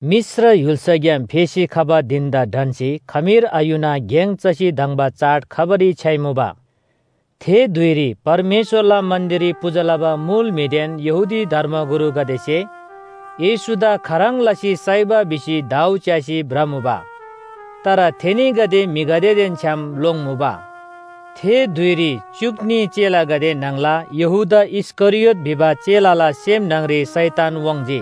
मिश्र य्‍हुल्‍साग्‍याम फेसी खबा धिन‍दा ढन्‍सी खमीर आयुना गेङ चसी धङ्बा चाड खबारी छ्‌याइमुबा। थे धुइरी परमेश्‍वरला मन्‍दिररी पूजा लबा मुल म्‍हिदेन यहूदी धर्मगुरुगदेसे येशूदा खाह्रङ् लसी साइबा भिसी दाउ च्‍यासी भ्रमुबा। तर थेनीगदे म्‍हिगदेदेन छ्‌याम लोङ्मुबा। थे धुइरी च्‍युक न्‍ही चेलागदे न्‍हङला यहूदा इस्‍करियोत भिबा चेलाला सेम न्‍हङरी शैतान वाङ्‌जी।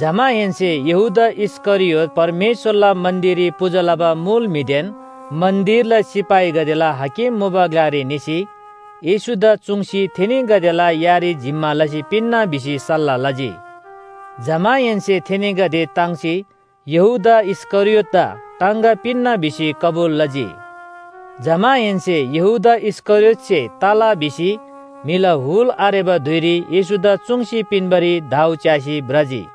जमाहेन्‍से यहूदा इस्‍करियोत परमेश्‍वरला मन्‍दिररी पूजा लबा मुल म्‍हिदेन मन्‍दिरला सिपाहीगदेला हाकिम मुबा ग्‍लारी निसी येशूदा चुङ्सी थेनीगदेला यारी जिम्‍मा लसी पिन्‍ना भिसी सल्‍लाह लजी। जमाहेन्‍से थेनीगदे ताङ्सी यहूदा इस्‍करियोतदा टाङगा पिन्‍ना भिसी कबुल लजी। जमाहेन्‍से यहूदा इस्‍करियोतसे तला, भिसी म्‍हिला हुल आरेबा धुइरी येशूदा चुङ्सी पिन्‍बारी दाउ च्‍यासी भ्रजी।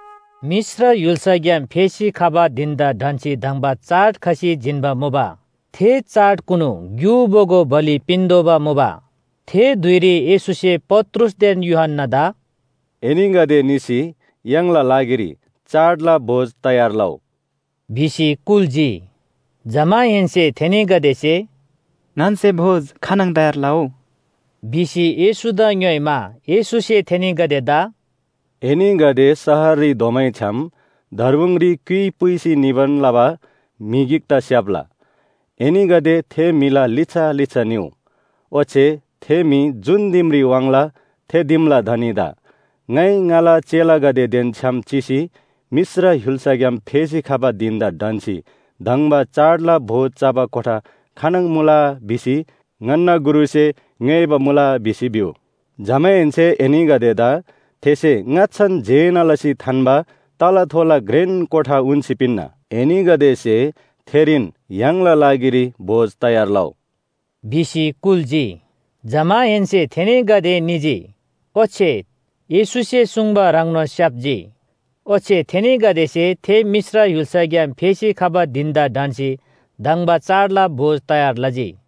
मिश्र य्‍हुल्‍साग्‍याम फेसी खबा धिन‍दा ढन्‍सी धङ्बा चाड खसी जिन्‍बा मुबा। थे चाडकुनु ग्‍यु बोगो बलि पिन्‍तोःबा मुबा। थे धुइरी येशूसे पत्रुसदेन यूहन्‍नादा “एनीगदे निसी य्‍हाङला लागिरी चाडला भोज तयार लउ” भिसी कुल्‍जी। जमाहेन्‍से थेनीगदेसे “ङन्‍से भोज खानङ तयार लउ” भिसी येशूदा ङ्‌योइमा, येशूसे थेनीगदेदा “एनीगदे शहररी धोमैछ्‌याम दर्बुङरी क्‍युइ पुइसी निबान लबा म्‍हि गिकदा स्‍याप्‍ला, एनीगदे थे म्‍हिला लिच्‍छा लिच्‍छा निउ। ओच्‍छे थे म्‍हि जुन दिमरी वाङ्ला थे दिमला धनीदा ‘ङाइ ङाला चेलागदेदेन छ्‌याम चिसी मिश्र य्‍हुल्‍साग्‍याम फेसी खबा धिन‍दा ढन्‍सी धङ्बा चाडला भोज चबा कोठा खानङ मुला? भिसी ङन्‍ना गुरुसे ङ्‌योइबा मुला’ भिसी भिउ। जमाहेन्‍से एनीगदेदा थेसे ङाच्‍छान जेना लसी थान्‍बा तलाथोला घ्रेन कोठा उन्‍सी पिन्‍ना। एनीगदेसे थेरीन य्‍हाङला लागिरी भोज तयार लउ” भिसी कुल्‍जी। जमाहेन्‍से थेनीगदे निजी ओच्‍छे येशूसे सुङ्बा ह्रङ्नोन स्‍याप्‍जी। ओच्‍छे थेनीगदेसे थे मिश्र य्‍हुल्‍साग्‍याम फेसी खबा धिन‍दा ढन्‍सी धङ्बा चाडला भोज तयार लजी।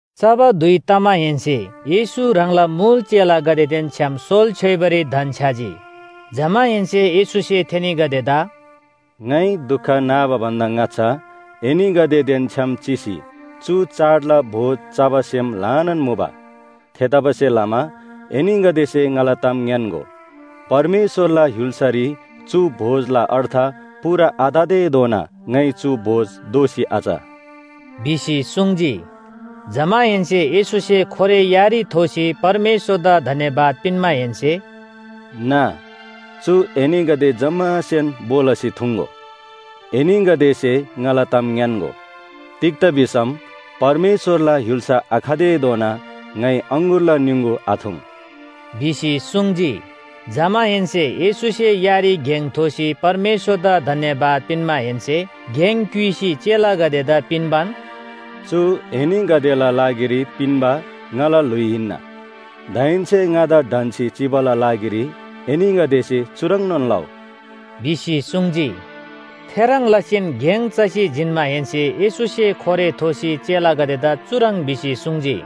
चबा धुइ तमाहेन्‍से येशू ह्राङला मुल चेलागदेदेन छ्‌याम सोल छ्‌योइबारी धन्‍छ्‌याजी। जमाहेन्‍से येशूसे थेनीगदेदा “ङाइ दुख नाबा भन्‍दा ङाच्‍छा एनीगदेदेन छ्‌याम चिसी चु चाडला भोज चबा सेम ल्‍हानान मुबा। थेतबासेलमा एनीगदेसे ङाला ताम ङ्‌यान्‍गो, परमेश्‍वरला य्‍हुल्‍सारी चु भोजला अर्थ पूरा आततेधोना ङाइ चु भोज दोःसी आच” भिसी सुङ्जी। जमाहेन्‍से येशूसे खोरे यारी थोसी परमेश्‍वरदा धन्‍यवाद पिन्‍माहेन्‍से “ना, चु एनीगदे जम्‍मासेन भो लसी थुङ्‍गो। एनीगदेसे ङाला ताम ङ्‌यान्‍गो, तिग्‍दा भिसम परमेश्‍वरला य्‍हुल्‍सा आखतेधोना ङाइ अङगुरला निङगु आथुङ्” भिसी सुङ्जी। जमाहेन्‍से येशूसे यारी गेङ थोसी परमेश्‍वरदा धन्‍यवाद पिन्‍माहेन्‍से गेङ क्‍युइसी चेलागदेदा पिन्‍बान, “चु एनीगदेला लागिरी पिन्‍बा ङाला ल्‍हुइ हिन्‍ना। दाहेन्‍से ङादा ढन्‍सी चिबाला लागिरी एनीगदेसे चुह्रङ्‌नोन लउ” भिसी सुङ्जी। थेह्रङ् लसीन गेङ चसी जिन्‍माहेन्‍से येशूसे खोरे थोसी चेलागदेदा चुह्रङ् भिसी सुङ्जी,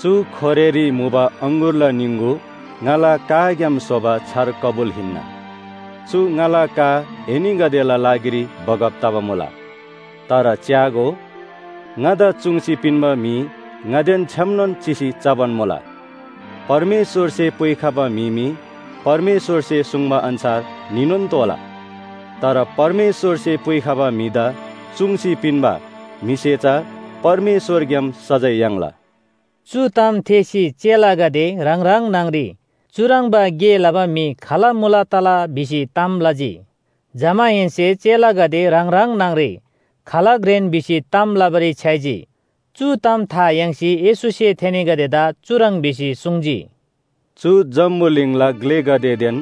“चु खोरेरी मुबा अङगुरला निङगु ङाला काग्‍याम स्‍होबा छार कबुल हिन्‍ना। चु ङाला का एनीगदेला लागिरी बगब तबा मुला। “तर च्‍यागो, ङादा चुङ्सी पिन्‍बा म्‍हि ङादेन छ्‌यामनोन चिसी चबान मुला। परमेश्‍वरसे पुइखबा म्‍हि मी परमेश्‍वरसे सुङ्बा अन्‍छार निनोन तोःला। तर परमेश्‍वरसे पुइखबा म्‍हिदा चुङ्सी पिन्‍बा म्‍हिसे चा परमेश्‍वरग्‍याम सजाय याङ्ला।” चु ताम थेःसी चेलागदे ह्राङ ह्राङ न्‍हङरी चुह्रङ्बा गे लबा म्‍हि खाल मुला तला? भिसी ताम लजी। जमाहेन्‍से चेलागदे ह्राङ ह्राङ न्‍हङरी खाल घ्रेन भिसी ताम लबारी छ्‌याइजी। चु ताम था याङ्सी येशूसे थेनीगदेदा चुह्रङ् भिसी सुङ्जी, “चु जम्‍बुलिङला ग्‍लेगदेदेन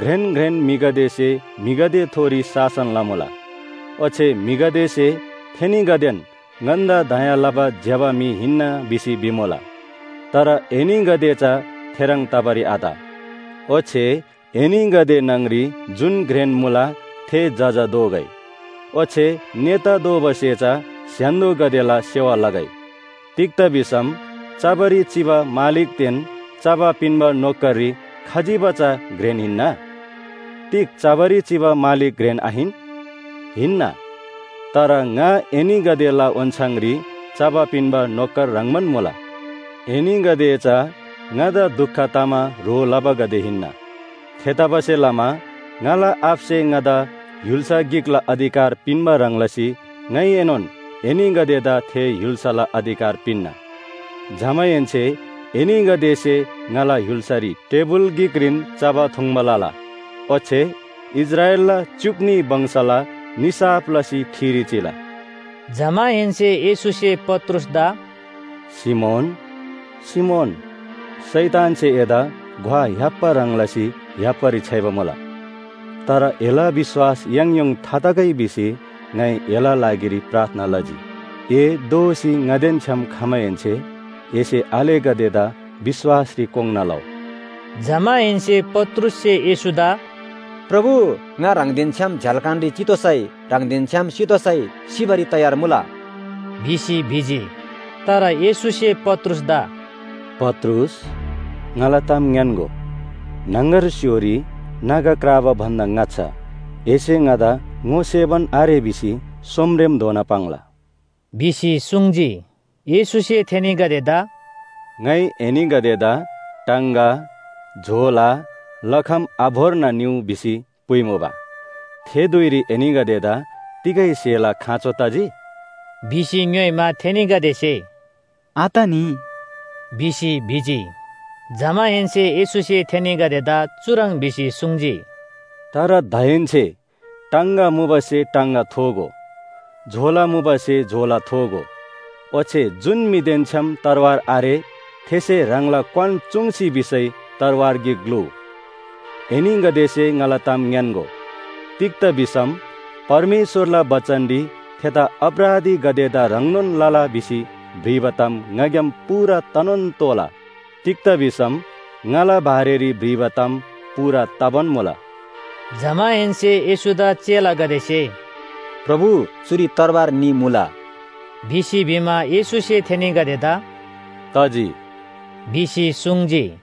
घ्रेन घ्रेन म्‍हिगदेसे म्‍हिगदेथोरी शासन लमुला। ओच्‍छे म्‍हिगदेसे थेनीगदेन ङन्‍दा दया लबा ज्‍यबा म्‍हि हिन्‍ना भिसी भिमुला। तर एनीगदे चा थेह्रङ् तबारी आत। ओच्‍छे एनीगदे न्‍हङरी जुन घ्रेन मुला थे जजा दोगै ओच्‍छे नेता दोबासे चा स्‍य्‍हान्‍दोगदेला सेवा लगै। तिग्‍दा भिसम चबारी चिबा मालिकदेन चबा पिन्‍बा नोकररी खजिबा चा घ्रेन हिन्‍ना? तिग चबारी चिबा मालिक घ्रेन आहिन? हिन्‍ना। तर ङा एनीगदेला ओन्‍छाङरी चबा पिन्‍बा नोकर ह्रङ्‌बान मुला। एनीगदे चा ङादा दुख तमा ह्रो लबागदे हिन्‍ना। थेतबासेलमा ङाला आबासे ङादा य्‍हुल्‍सा गिकला अधिकार पिन्‍बा ह्रङ् लसी ङाइएनोन एनीगदेदा थे य्‍हुल्‍साला अधिकार पिन्‍ना। जमाहेन्‍से एनीगदेसे ङाला य्‍हुल्‍सारी टेबुल गिकरीन चबा थुङ्बा लला। ओच्‍छे इस्राएलला च्‍युक न्‍ही वंशला निसाफ लसी ठिरी चिला।” जमाहेन्‍से येशूसे पत्रुसदा “सिमोन, सिमोन, शैतानसे एदा ग्‍वा य्‍हाप्‍बा ह्रङ् लसी य्‍हाप्‍बारी छ्‌याइबा मुला। तर एला विश्‍वास याङयोङ थातगै भिसी ङाइ एला लागिरी प्रार्थना लजी। ए दोःसी ङादेन छ्‌याम खमाहेन्‍से एसे आलेगदेदा विश्‍वासरी कोङ्‌ना लउ। जमाहेन्‍से पत्रुससे येशूदा “प्रभु, ङा ह्राङदेन छ्‌याम झ्‍याल्‍खानरी चितोःसै ह्राङदेन छ्‌याम सितोःसै सिबारी तयार मुला” भिसी भिजी। तर येशूसे पत्रुसदा “पत्रुस, ङाला ताम ङ्‌यान्‍गो, न्‍हङगर स्‍य्‍होरी नागा क्राबा भन्‍दा ङाच्‍छा एसे ङादा ङोसेबान आरे भिसी सोमरेमधोना पाङ्ला” भिसी सुङ्जी। येशूसे थेनीगदेदा “ङाइ एनीगदेदा टाङगा, झोला, लखम आभोर्ना निउ भिसी पुइमुबा। थे धुइरी एनीगदेदा तिगै स्‍हेला खाँचो तजी? भिसी ङ्‌योइमा, थेनीगदेसे “आतनी” भिसी भिजी। जमाहेन्‍से येशूसे थेनीगदेदा चुह्रङ् भिसी सुङ्जी, “तर दाहेन्‍से टाङगा मुबासे टाङगा थोगो, झोला मुबासे झोला थोगो, ओच्‍छे जुन म्‍हिदेन छ्‌याम तरवार आरे थेसे ह्राङला क्‍वान चूङ्सी भिसै तरवार गिक ग्‍लुउ। एनीगदेसे ङाला ताम ङ्‌यान्‍गो, तिग्‍दा भिसम परमेश्‍वरला बचनरी ‘थेदा अपराधीगदेदा ह्रङ्नोन लला भिसी भ्रिबा ताम ङाग्‍याम पूरा तनोन तोःला’ तिग्‍दा भिसम ङाला बारेरी भ्रिबा ताम पूरा तबान मुला।” जमाहेन्‍से येशूदा चेलागदेसे “प्रभु, चुरी तरवार न्‍ही मुला” भिसी भिमा, येशूसे थेनीगदेदा “तजी” भिसी सुङ्जी।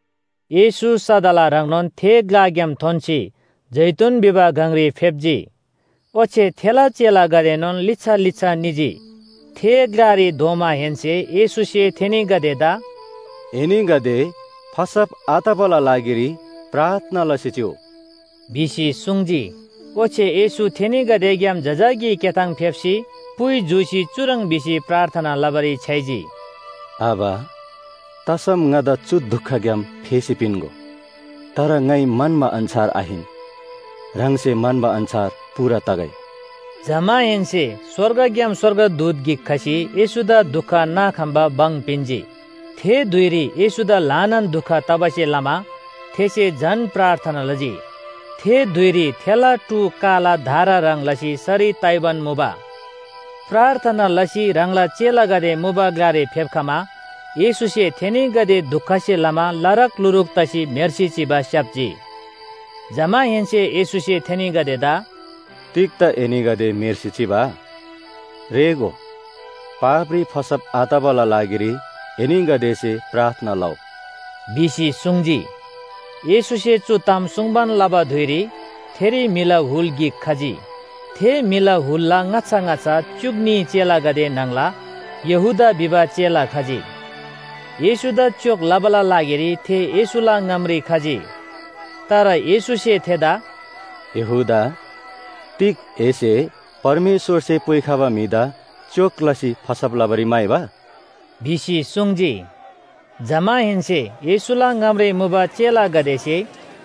येशू सदला ह्रङ्नोन थे ग्‍लाग्‍याम थोन्‍सी जैतून भिबा गङरी फेप्‍जी। ओच्‍छे थेला चेलागदेएनोन लिच्‍छा लिच्‍छा निजी। थे ग्‍लारी धोमाहेन्‍से येशूसे थेनीगदेदा “एनीगदे फसब आतबाला लागिरी प्रार्थना लसी चिउ” भिसी सुङ्जी। ओच्‍छे येशू थेनीगदेग्‍याम जजाकी क्‍याथाङ फेप्‍सी पुइ जूसी चुह्रङ् भिसी प्रार्थना लबारी छ्‌याइजी। “आबा, तसम ङादा चु दुखग्‍याम फेसी पिन्‍गो। तर ङाइ म्‍हन्‍बा अन्‍छार आहिन, ह्राङसे म्‍हन्‍बा अन्‍छार पूरा तगै।” जमाहेन्‍से स्‍वर्गग्‍याम स्‍वर्गदूत गिक खसी येशूदा दुख नाखम्‍बा भङ पिन्‍जी। थे धुइरी येशूदा ल्‍हानान दुख तबासे लमा थेसे झन प्रार्थना लजी। थे धुइरी थेला टू काला धारा ह्रङ् लसी सरी ताइबान मुबा। प्रार्थना लसी ह्राङला चेलागदे मुबा ग्‍लारी फेप्‍खमा येशूसे थेनीगदे दुखसे लमा लारकलुरूक तसी म्‍हेर्सी चिबा स्‍याप्‍जी। जमाहेन्‍से येशूसे थेनीगदेदा “तिग्‍दा एनीगदे म्‍हेर्सी चिबा? रेःगो, पापरी फसब आतबाला लागिरी एनीगदेसे प्रार्थना लउ” भिसी सुङ्जी। येशूसे चु ताम सुङ्बान लबा धुइरी थेरी म्‍हिला हुल गिक खजी। थे म्‍हिला हुलला ङाच्‍छा ङाच्‍छा च्‍युक न्‍ही चेलागदे न्‍हङला यहूदा भिबा चेला खजी। येशूदा च्‍योक लबाला लागिरी थे येशूला ङामरी खजी। तर येशूसे थेदा “यहूदा, तिग एसे परमेश्‍वरसे पुइखबा म्‍हिदा च्‍योक लसी फसब लबारी म्‍हाइबा?” भिसी सुङ्जी। जमाहेन्‍से येशूला ङामरी मुबा चेलागदेसे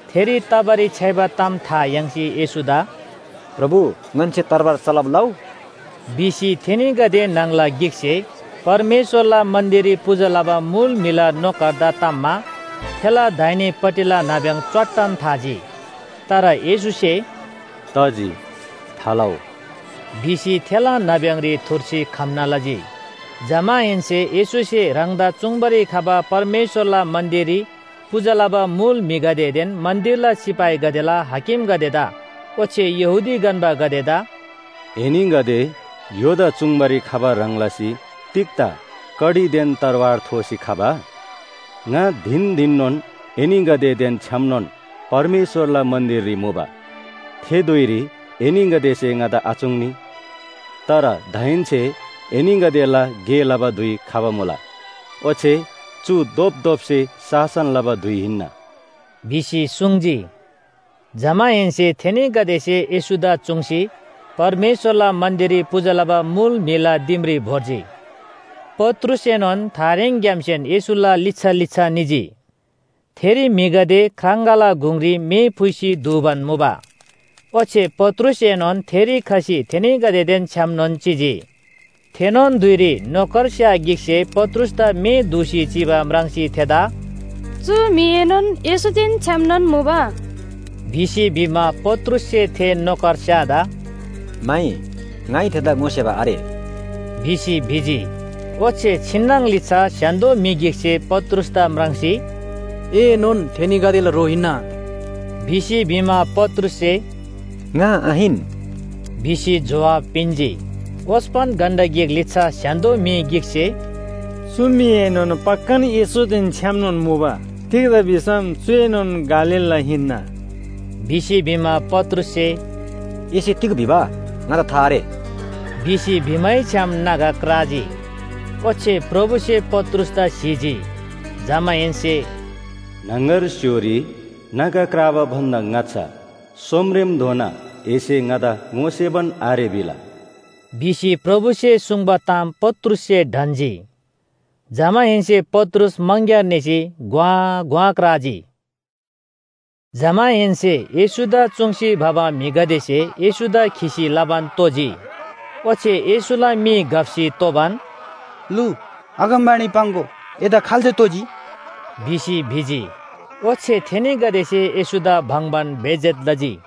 थेरी तबारी छ्‌याइबा ताम था याङ्सी येशूदा “प्रभु, ङन्‍से तरवार चलब लउ?” भिसी, थेनीगदे न्‍हङला गिकसे परमेश्‍वरला मन्‍दिररी पूजा लबा मुल म्‍हिला नोकरदा ताम्‍मा थेला दाहिनेपट्टिला नाब्‍यङ च्‍वाट्टन थाजी। तर येशूसे “तजी थालउ” भिसी थेला नाब्‍यङरी थुर्सी खम्‍ना लजी। जमाहेन्‍से येशूसे ह्राङदा चुङ्बारी खबा परमेश्‍वरला मन्‍दिररी पूजा लबा मुल म्‍हिगदेदेन मन्‍दिरला सिपाहीगदेला हाकिमगदेदा ओच्‍छे यहूदी गन्‍बागदेदा “एनीगदे य्‍होदा चुङ्बारी खबा ह्रङ् लसी तिग्‍दा कडीदेन तरवार थोसी खबा? ङा धिन धिननोन एनीगदेदेन छ्‌यामनोन परमेश्‍वरला मन्‍दिररी मुबा। थे धुइरी एनीगदेसे ङादा आचुङ्नी। तर दाहेन्‍से एनीगदेला गे लबा धुइ खबा मुला ओच्‍छे चु धोपधोपसे शासन लबा धुइ हिन्‍ना” भिसी सुङ्जी। जमाहेन्‍से थेनीगदेसे येशूदा चुङ्सी परमेश्‍वरला मन्‍दिररी पूजा लबा मुल म्‍हिला दिमरी भोर्जी। पत्रुसएनोन थारेङग्‍यामसेन येशूला लिच्‍छा लिच्‍छा निजी। थेरी म्‍हिगदे ख्राङगाला गुङरी मे फुइसी दूबान मुबा। ओच्‍छे पत्रुसएनोन थेरी खसी थेनीगदेदेन छ्‌यामनोन चिजी। थेनोन धुइरी नोकरस्‍या गिकसे पत्रुसदा मे दूसी चिबा म्राङ्सी थेदा “चु म्‍हिएनोन येशूदेन छ्‌यामनोन मुबा” भिसी भिमा, पत्रुससे थे नोकरस्‍यादा “माइ, ङाइ थेदा ङोसेबा आरे” भिसी भिजी। ओच्‍छे छिन्‍नङ लिच्‍छा स्‍य्‍हान्‍दो म्‍हि गिकसे पत्रुसदा म्राङ्सी, “एएनोन थेनीगदेला ह्रो हिन्‍ना” भिसी भिमा, पत्रुससे “ङा आहिन” भिसी जोहाब पिन्‍जी। ओस्‍पन घण्‍टा गिक लिच्‍छा स्‍य्‍हान्‍दो म्‍हि गिकसे “चु म्‍हिएनोन पक्‍कान येशूदेन छ्‌यामनोन मुबा, तिग्‍दा भिसम चुएनोन गालीलला हिन्‍ना” भिसी भिमा, पत्रुससे “एसे तिग भिबा, ङादा था आरे” भिसी भिमैछ्‍याम नागा क्राजी। ओच्‍छे प्रभुसे पत्रुसदा स्‍हीजी। जमाहेन्‍से “न्‍हङगर स्‍य्‍होरी नागा क्राबा भन्‍दा ङाच्‍छा सोमरेमधोना एसे ङादा ङोसेबान आरे भिला” भिसी प्रभुसे सुङ्बा ताम पत्रुससे ढन्‍जी। जमाहेन्‍से पत्रुस मङग्‍यार निसी घ्‍वाँ घ्‍वाँ क्राजी। जमाहेन्‍से येशूदा चुङ्सी भबा म्‍हिगदेसे येशूदा खिसी लबान तोजी। ओच्‍छे येशूला मी घप्‍सी तोबान, “लु, अगमवाणी पाङ्‍गो, एदा खाल्‍से तोजी?” भिसी भिजी। ओच्‍छे थेनीगदेसे येशूदा बङ्‍बान बेइज्‍जत लजी।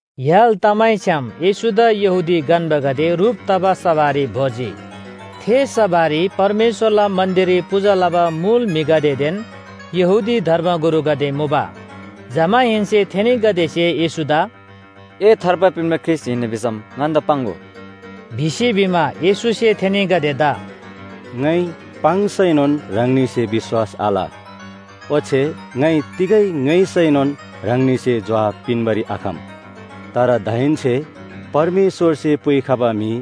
य्‍हाल तमैछ्‌याम येशूदा यहूदी गन्‍बागदे ह्रुप तबा सभारी भोर्जी। थे सभारी परमेश्‍वरला मन्‍दिररी पूजा लबा मुल म्‍हिगदेदेन यहूदी धर्मगुरुगदे मुबा। जमाहेन्‍से थेनीगदेसे येशूदा “ए थार्बा पिन्‍बा ख्रीष्‍ट हिन्‍ना भिसम ङन्‍दा पाङ्‍गो” भिसी भिमा, येशूसे थेनीगदेदा “ङाइ पाङ्सैनोन ह्राङनीसे विश्‍वास आल। ओच्‍छे ङाइ तिगै ङ्‌योइसैनोन ह्राङनीसे जोहाब पिन्‍बारी आखम। तर दाहेन्‍से परमेश्‍वरसे पुइखबा म्‍हि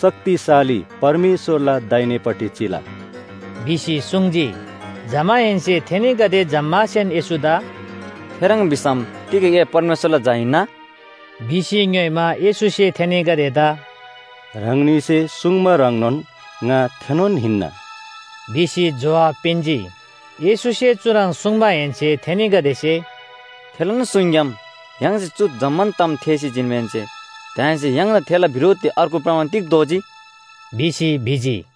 शक्तिशाली परमेश्‍वरला दाहिनेपट्टि चिला” भिसी सुङ्जी। जमाहेन्‍से थेनीगदे जम्‍मासेन येशूदा “थेह्रङ् भिसम तिग ए परमेश्‍वरला झा हिन्‍ना?” भिसी ङ्‌योइमा, येशूसे थेनीगदेदा “ह्राङनीसे सुङ्बा ह्रङ्नोन ङा थेनोन हिन्‍ना” भिसी जोहाब पिन्‍जी। येशूसे चुह्रङ् सुङ्माहेन्‍से थेनीगदेसे “थेलान सुङग्‍याम य्‍हाङसे चु जम्‍मान ताम थेःसी जिन्‍माहेन्‍से दाहेन्‍से य्‍हाङदा थेला बिरोधरी अर्गु प्रमाण तिग्‍दा तोःजी” भिसी भिजी।